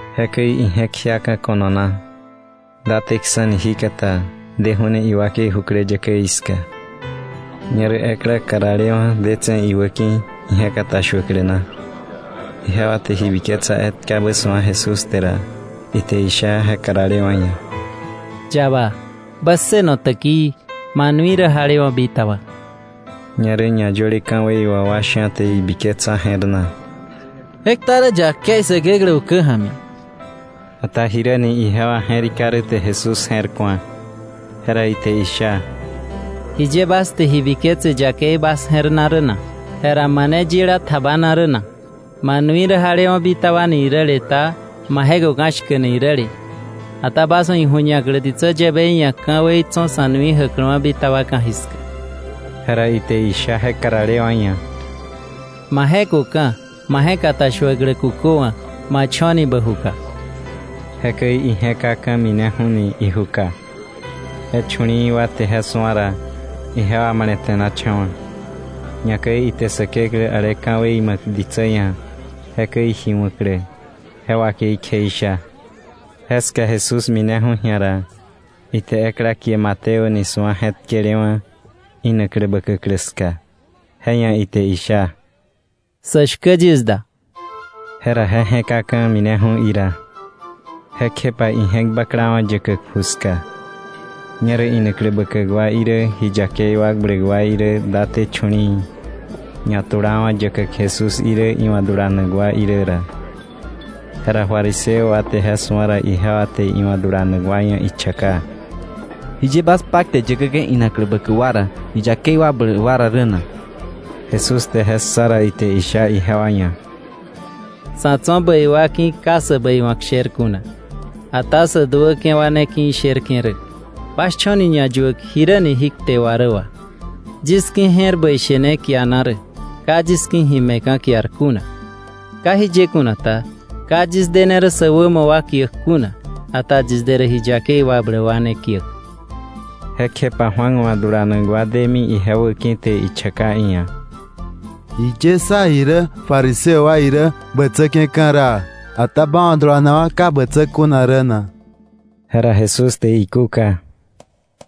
Jekäi ije̱k jiaka̱ ko̱no na, dateksa̱ni jíkata, deju̱ ni iwakei jukläyäkäí ska. Ñerä ekla karalewa̱ detse̱ iwä ki̱ka ije̱k katashuäklä na. Ijewa te ji biketsa etkabä su̱a Jesús te ra, ite isha je karalewa̱ ia̱: —Yaba, bä ssëno täkii, ma nui rä jalewa̱ bitaba. Ñerä ñayöle ka̱wei wà wa sha̱ te ibiketsa je̱r na: “Je kta rä yakei Säkeklä ukä ja̱mi.” Ata jiräni ijewa je̱rika rä te Jesús je̱r ku̱a. Jera ite isha: —¿Jiye bas te ji biketse yakei bas je̱r na rä na? Jera ¿mane yila tjabana rä na: ‘Ma nui rä jalewa̱ bitaba’ ni iräle, ta ‘ma je̱köka̱ shkäk’ ni iräle? Ata bas wa̱ iju̱ñaklä ditsä yäbei ia̱ ka̱wei tso̱ sa̱ nui jäkläwa̱ bitaba ka̱jiska—jera ite isha je karalewa̱ ia̱—: Ma je̱köka̱, ma je̱katashuäklä kuköwa̱, ma cho̱ni bä juka. Jekäi ije je̱kaka̱, mineju̱ni ijuka. Je chu̱li̱i̱ wa te je su̱a ra, ijewa male̱te̱nacha̱wa̱, ñakäi ite Säkeklä, ale ka̱wei ma̱k ditsä ia̱ jekäi ji wa̱klä, je wakei kjeisha. Jeska Jesús mineju̱ ji̱a ra, ite ekla kie Mateo ni su̱a je̱tkelewa̱ inaklä bäkäklä ska, je ia̱ ite isha: —Sä shkä yis da. Jera je je̱kaka̱ mineju̱ ira. Jekjepa ije̱k baklawa̱ yäkäk ju ska. Ñerä inaklä bäkäk wa irä, ji yakei wakbläk wa irä daté chu̱li̱i̱, ñatulawa̱ yäkäk Jesús irä, iwa̱ dulanak wa irä ra. Jera fariseo wa te je su̱a ra, ijewa te iwa̱ dulanak wa ia̱ ichaka: —¿Jiye bas paktäk yäkäke̱ inaklä bäkäk wa ra ji yakei wakbläk wa ra rä na? Jesús te je ssa ra, ite isha ijewa ia̱: —Sa̱ tso̱ bäi wa ki̱ ka sä bäiwa̱k sher kuna, ata sä duäke̱ wa ne ki̱ isherke̱ rä. Bas cho̱ ni ñayuäk jiräni jí kte wà rä wà: “Yis ki̱ je̱r bäi she ne kiana rä, ka yis ki̱ ji me̱ka̱ kiar kuna.” Ka irä jiye kuna ta, ka yis dene rä sä wämo wa kiäk kuna, ata yis de rä ji yakei wakbläk wa ne kiäk. Jekjepa Juan wa̱ dulanak wa demi ije wäki̱ te ichaka iia̱: —¿Jiye sá irä fariseo wa irä jewa bätsäke̱ ka̱raa, ata ba wa̱ dulanak wa ka bätsä kuna rä na? Jera Jesús te ikúka: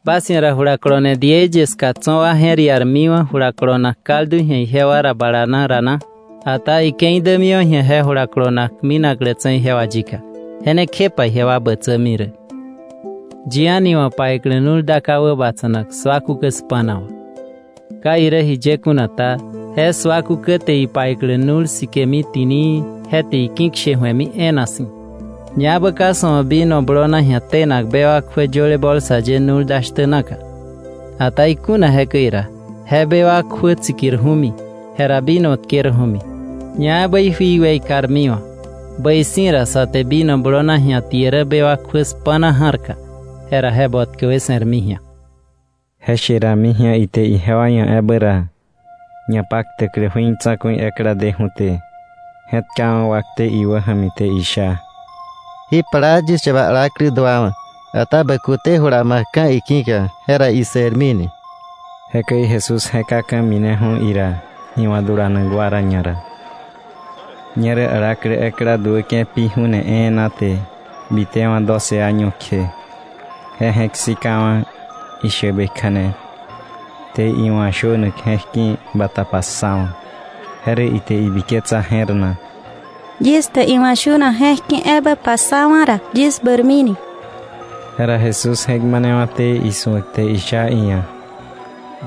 —¿Bas ia̱ ra julakolone diei ye ska tso̱ wa je̱r iarmiwa̱ jula kolonak kaldu ji̱a ijewa ra bala na ra na? Ata ike̱i dämiwa̱ ji̱a je jula kolonak minaklätse̱ ijewa yika, je ne kjepa ijewa bätsämi rä. “Yi a̱ni wa̱ paiklä nu̱l da ka wäbatsa̱nak sua kukä spa̱na wà. Ka irä jiye kuna ta, je sua kukä te je paiklä nu̱l sikemi ti̱nii, je te iki̱kshe ju̱emi e̱e̱na si̱. Ñaebä ka sa̱ wa̱ vino blona ji̱a tenak bewak kjuä yöle bolsa ye nu̱l da shtä naka. Ata ikuna jekäi ra, je bewak kjuä tsikirju̱mi, jera vino tkerju̱mi, ñaebä ijui weikarmiwa̱. Bäi si̱ ra sä te vino blona ji̱a tie rä bewak kjuä spa̱na ja̱rka, jera je botkäwe se̱rmi ji̱a.” Je she rami ji̱a ite ijewa ia̱ ebä ra, ñapaktäklä jui tsa̱ku̱i ekla deju̱té, je̱tkawa̱ wakte iwä ja̱mi te isha: —Ji plaa yis yaba alaklä duawa̱, ata bä kute jula ma̱kka̱ iki̱ka, jera ise̱rmi ni. Jekäi Jesús je̱kaka̱ mineju̱ ira, iwa̱ dulanak wa ra ñara. Ñerä alaklä ekla duäke̱ pi ju̱ne e̱e̱na te, bitewa̱ doce año kje, je je̱k sikawa̱ ishäbe kja̱ne, te iwa̱ shönak je̱k ki̱ bata passawa̱. Je rä ite ibiketsa je̱r na: “Yis te iwa̱ shönak je̱k ki̱ ebä passawa̱ ra, yis bäirmini,” ki̱ka. Jera Jesús je̱k manewa̱té isu̱ak te isha iia̱: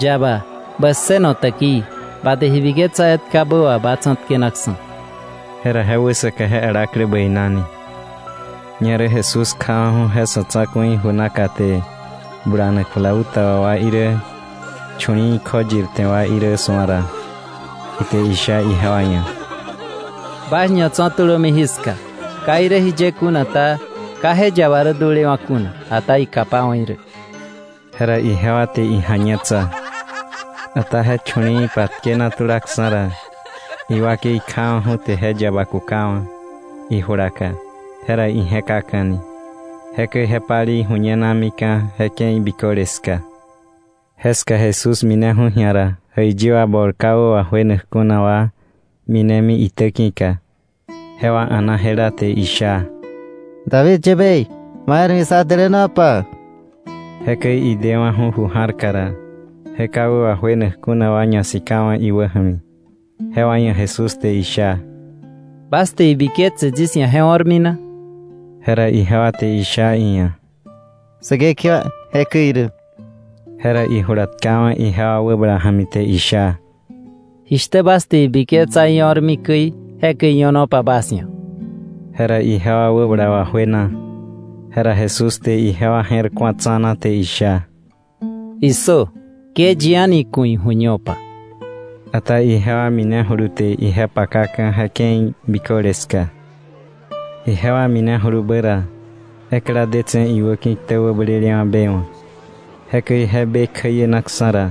—Yaba, bä ssëno täkii, ba te ji biketsa etkabä wà ba tsa̱tkenaksa̱. Jera je wäsaka je alaklä bäinani. Ñerä Jesús kjawa̱ju̱ je sa̱ tsa̱ku̱i ju naka te bulanak flauta wà wa irä, chu̱li̱i̱ kjoyir te wa irä su̱a ra, ite isha ijewa ia̱: —Bas ñatso̱ tulömi jiska. Ka irä jiye kuna ta, ka je yaba rä dulewa̱ kuna, ata ikapawa̱ irä. Jera ijewa te ija̱ñetsa. Ata je chu̱li̱i̱ patkena tulaksa̱ ra, iwakei kjawa̱ju̱ te je yaba kukawa̱ ijulaka, jera ije̱kaka̱ni. Jekäi je palei ju̱ñenamika̱ je ke̱i biköle ska. Jeska Jesús mineju̱ ji̱a ra, jäiyi wa bol ka wä wajuenak kuna wa minemi iitäki̱ka, jewa a̱na jela te isha: —David yäbei, ma je̱r ja̱mi sá dälänopa. Jekäi idewa̱ju̱ ju ja̱rka ra, je ka wä wajuenak kuna wa ñasikawa̱ iwä ja̱mi, jewa ia̱ Jesús te isha: —¿Bas te ibiketse yis ia̱ je o̱rmi na? Jera ijewa te isha iia̱: —Säkekewa, jekäi irä. Jera ijula tkawa̱ ijewa wäbala ja̱mi te isha: —Jishtä bas te ibiketsa io̱rmi käi, jekäi io̱nopa bas ia̱. Jera ijewa wäbala wajuena. Jera Jesús te ijewa je̱r ku̱a tsa̱na, te isha: “¡Issö! Ke yi a̱ni ku̱ ijuñopa.” Ata ijewa minejulu te ije pakaka̱ je ke̱i biköle ska. Ijewa minejulubä ra, ekla detse̱ iwäki̱ ktä wäblelewa̱ be wa̱. Jekäi je be kjäienaksa̱ ra,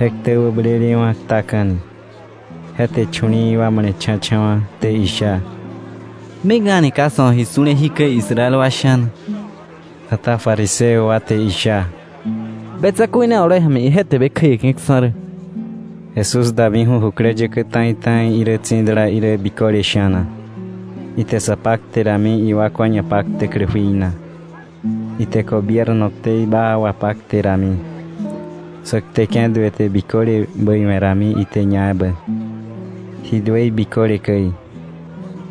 je ktä wäblelewa̱ ktaka̱ni. Je te chu̱li̱i̱ wa male̱cha̱cha̱wa̱, te isha: —¡Mik a̱ni ka sa̱ wa̱ ji su̱le jikäi Israel wa sha̱na! Ata fariseo wa te isha: —Be tsa̱ku̱i ne oloi ja̱mi ije te be kjäieke̱ksa̱ rä. Jesús damiju̱ jukläyäkä ta̱i ta̱i irä tsi̱dala irä biköle sha̱na. Ite sa pakte rami iwakwa ñapaktäklä jui na; ite gobierno ktei baa wapakte rami, sä kteke̱ duë te biköle bäi we̱rami ite ñaebä, ji duëi biköle käi.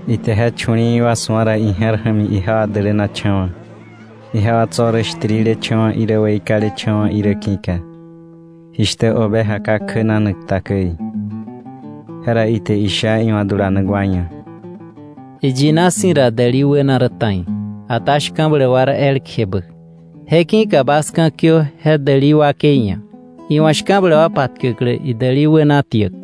Ite je chu̱li̱i̱ wa su̱a ra, ije̱r ja̱mi ijewa dälänacha̱wa̱, ijewa tso̱ rä shtirilecha̱wa̱ irä weikalecha̱wa̱ irä ki̱ka, jishtä oveja ka kjänanak ta käi. Jera ite isha iwa̱ dulanak wa ia̱: —Iyina si̱ ra däli wäna rä ta̱i, ata shka̱bläk wa rä elkjebä. Je ki̱ka bas ka̱kiö je däli wakei ia̱, iwa̱ shka̱bläk wa patkäklä idäli wäna tiäk.